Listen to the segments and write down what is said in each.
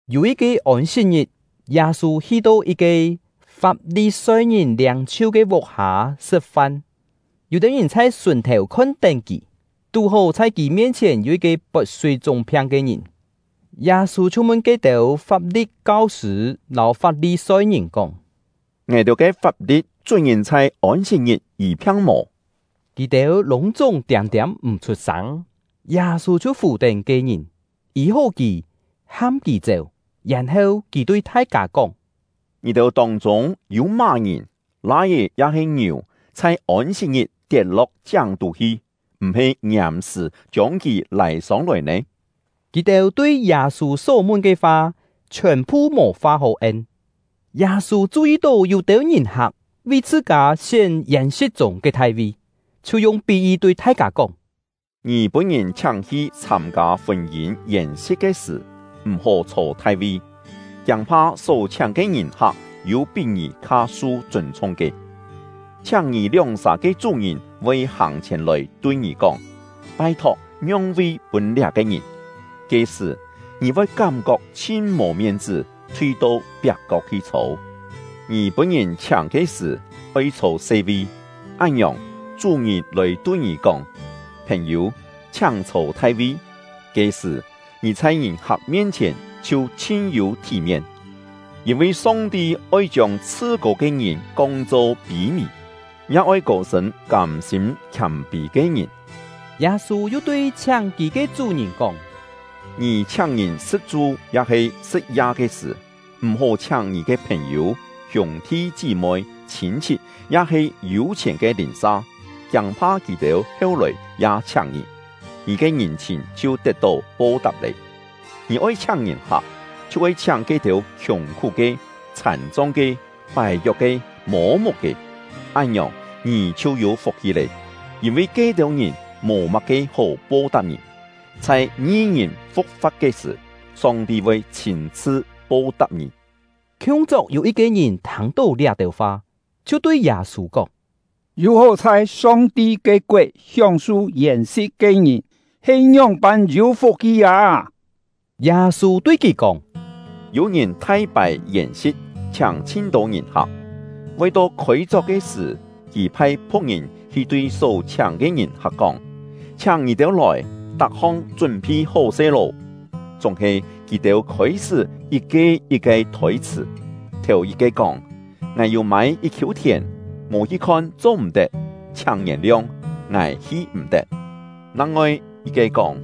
Yû yit-ke Ôn-sit-ngit, Yâ-sû hi-to yit-ke Fap-li-soi-ngìn liâng-chhiu ke vuk-hâ sṳ̍t-fan; yû-têu ngìn chhai sùn-thèu khon-tén kì. Tú-hó, chhai kì mien-chhièn yû yit-ke pot súi-chúng-phiang ke ngìn. Yâ-sû chhiu mun ke-têu Fap-li̍t kau-sṳ̂ lâu Fap-li-soi-ngìn kóng: “Ngài-têu ke fap-li̍t chún ngìn chhai Ôn-sit-ngit yî-phiang mò?” Kì-têu lûng-chúng tiâm-tiâm m̀ chhut-sâng. Yâ-sû chhiu fù-tén ke-ngìn, yî-hó kì, ham kì chéu. Yèn-heu, kì tui thai-kâ kóng: “Ngì-têu tông-chûng yû má-ngìn, lai-é ya-he ngiù chhai Ôn-sit-ngit tiet-lo̍k chiáng-tú hi, m̀-he ngiàm-sṳ̀ chiông kì lâi sông-lòi nè?” Kì-têu tui Yâ-sû só mun ke fa chhiòn-phu mò fa hó en. Yâ-sû chu-yi tó yû-têu ngìn-hak vi chhṳ-kâ sién yèn-si̍t chûng ke thai-vi, chhiu yung pí-yi tui thai-kâ kóng: “Ngì pûn-ngìn chhiáng-hi chhâm-kâ fûn-yîn yèn-si̍t ke sṳ̀, m̀-hó chhô thai-vi, kiâng-pha só chhiáng ke ngìn-hak yû pí ngì kha su chûn-chhung ke. Chhiáng ngì lióng-sà ke chú-ngìn voi hàng-chhièn lòi tui ngì kóng: ‘Pai-thok ngiong-vi pûn liá-ke ngìn!’ Ke-sṳ̀, ngì voi kám-kok chhin mò mien-chṳ́, thui-to piak-kok hi chhô. Ngì pûn-ngìn chhiáng ke sṳ̀, oi chhô se-vi, án-ngiòng, chú-ngìn lòi tui ngì kóng: ‘Phèn-yû, chhiáng chhô thai-vi.’ Ke-sṳ̀, ngì chhai ngìn-hak mien-chhièn chhiu chhin yû thí-mien. Yîn-vi Song-ti oi chiông chhṳ-kô ke ngìn kong-cho pî-mì, ya oi kô-sṳ̂n kâm-sîm khiâm-pî ke ngìn.” Yâ-sû yu tui chhiáng kì ke chú-ngìn kóng: “Ngì chhiáng ngìn sṳ̍t-chu ya-he sṳ̍t-ya ke sṳ̀, m̀-hó chhiáng ngì ke phèn-yû, hiûng-thi chí-moi, chhîn-chhit, ya-he yû-chhièn ke lìn-sa, kiâng-pha kì-têu heu-lòi ya chhiáng ngì, ngì ke ngìn-chhìn chhiu tet-tó po-tap lé. Ngì oi chhiáng ngìn-hak, chhiu oi chhiáng ke-têu khiùng-khú-ke, chhàn-chong ke, pài-kiok-ke, mô-muk-ke; án-ngiòng, ngì chhiu yû fuk-hi lé, yîn-vi ke-têu ngìn mò má-ke hó po-tap ngì. Chhai ngi-ngìn fu̍k-fa̍t ke sṳ̀, Song-ti voi chhîn-chhṳ po-tap ngì.” Khiung-chok yû yit-ke ngìn thâng-tó liá-têu fa, chhiu tui Yâ-sû kóng: “Yû-hó chhai Song-ti ke koet hióng-su yèn-si̍t ke ngìn he ngióng-pân yû fuk-hi â!” Yâ-sû tui kì kóng: “Yû ngìn thai pài yèn-si̍t, chhiáng chhin-tô ngìn-hak. Voi to khôi-chok ke sṳ̀, kì phai phu̍k-ngìn hi tui só chhiáng ke ngìn-hak kóng: ‘Chhiáng ngì-têu lòi, tak-hong chún-phi hó-se lô!’ Chúng-he kì-têu khôi-sṳ́ yit-ke yit-ke thôi-chhṳ̀. Thèu-yit-ke kóng: ‘Ngài yû mâi yit-khiû thièn, mò hi khon cho-m̀-tet. Chhiáng ngièn-liong, ngài hi-m̀-tet.’ Nang-ngoi yit-ke kóng: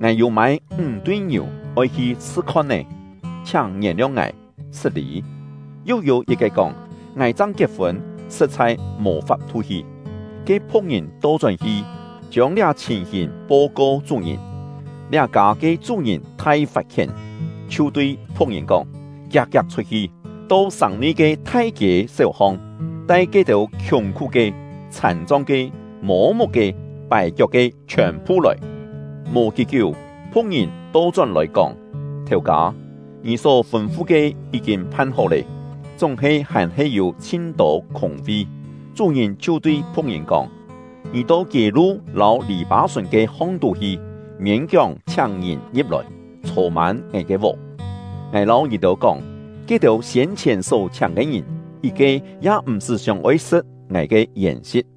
‘Ngài yû mâi ńg-tui ngiù, oi hi chhṳ khon-é; chhiáng ngièn-liong ngài, sṳt-lî.’ Yu yû yit-ke kóng: ‘Ngài chang kiet-fûn, sṳ̍t-chhai mò fap-thu hi.’ Ke phu̍k-ngìn to-chón-hi, chiông liá chhìn-hìn po-ko chú-ngìn. Liá-kâ ke chú-ngìn thai fat-khién, chhiu tui phu̍k-ngìn kóng: ‘Kiak-kiak chhut-hi, to sàng-nui ke thai-kiê séu-hong, tai ke-têu khiùng-khú-ke, chhàn-chong ke, mô-muk-ke, pài-kiok-ke chhiòn-phu lòi.’ Mò kí-kiú, phu̍k-ngìn to-chón-lòi, kóng: ‘Thèu-kâ, ngì só fûn-fu ke yí-kîn phan-hó lé, chúng-he hàn-he yû chhin-tô khûng-vi!’ Chú-ngìn chhiu tui phu̍k-ngìn kóng: ‘Ngì to kiê-lu lâu lì-pâ-sùn ke hong-tú hi, miên-kióng chhiáng ngìn ngi̍p-lòi, chhô-mân ngài ke vuk. Ngài lâu ngì-têu kóng, ke-têu siên-chhièn só chhiáng ke ngìn, yit-ke ya m̀-sṳ́ sióng-oi sṳ̍t ngài ke yèn-si̍t!’”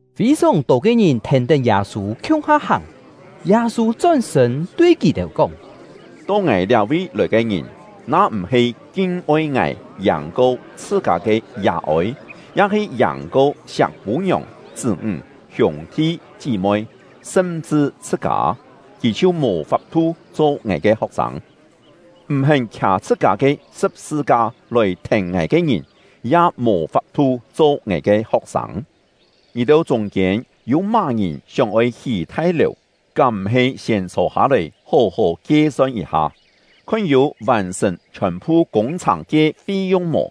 Fî-sòng tô ke ngìn thèn-tén Yâ-sû khiung-ha hàng. Yâ-sû chón-sṳ̂n tui kì-têu kóng: “To ngài liá-vi lòi ke ngìn, na m̀-he kin-oi ngài yàng-ko chhṳ-kâ ke yà-ôi, ya-he yàng-ko siak pû-ngiòng, chṳ́-ńg, hiûng-thi, chí-moi, sṳm-chṳ chhṳ-kâ, kì chhiu mò fap-thu cho ngài ke ho̍k-sâng. M̀-hén khià chhṳ-kâ ke sṳ̍p-sṳ-ka lòi thèn ngài ke ngìn, ya mò fap-thu cho ngài ke ho̍k-sâng. Ngì-têu chûng-kiên yû má-ngìn sióng-oi hí thai-lèu, kám m̀-he siên chhô-hâ-lòi hó-hó kie-son yit-ha, khon yû vàn-sṳ̀n chhiòn-phu kûng-chhàng ke fi-yung mò?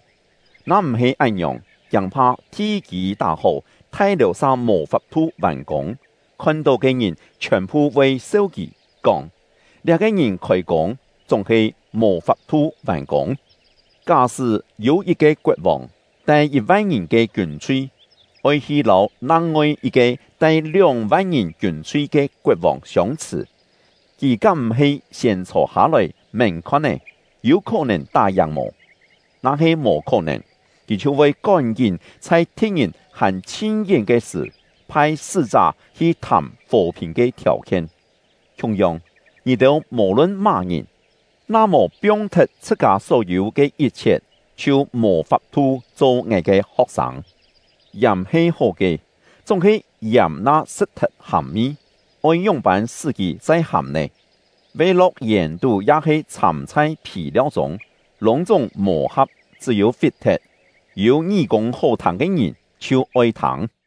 Na m̀-he án-ngiòng, kiâng-pha thi-kî tá-hó, thai-lèu sa mò fap-thu vàn-kûng, khon-tó ke ngìn chhiòn-phu voi seu kì, kóng: ‘Liá-ke ngìn khôi-kûng, chúng-he mò fap-thu vàn-kûng!’ Ká-sṳ́ yû yit-ke koet-vòng, tai yit-van ngìn ke kiûn-chhui, oi hi lâu nang-ngoi yit-ke tai lióng-van ngìn kiûn-chhui ke koet-vòng siông-chhṳ̀, kì kám m̀-he siên chhô-hâ-lòi mén-khon-é, yû khó-nèn tá-yàng mò? Na-he mò khó-nèn, kì chhiu voi kón-kín chhai thi̍t-ngìn hàn chhin-yén ke sṳ̀, phai sṳ́-chá hi thàm fò-phìn ke thiàu-khien. Khiung-yong, ngì-têu mò-lun má-ngìn, na mò piong-thet chhṳ-kâ só-yû ke yit-chhiet, chhiu mò fap-thu cho ngài ke ho̍k-sâng. “Yàm he hó ke, chúng-he yàm na sṳt-thet hàm-mi, oi ngióng-pân sṳ́ kì chai hàm nè? Ve-lo̍k yèn-tú ya-he chhâm chhai phì-liau-chûng, lûng-chúng mò-ha̍p, chṳ́-yû fit-thet. Yû ngí-kûng hó-thâng ke ngìn, chhiu oi thâng!”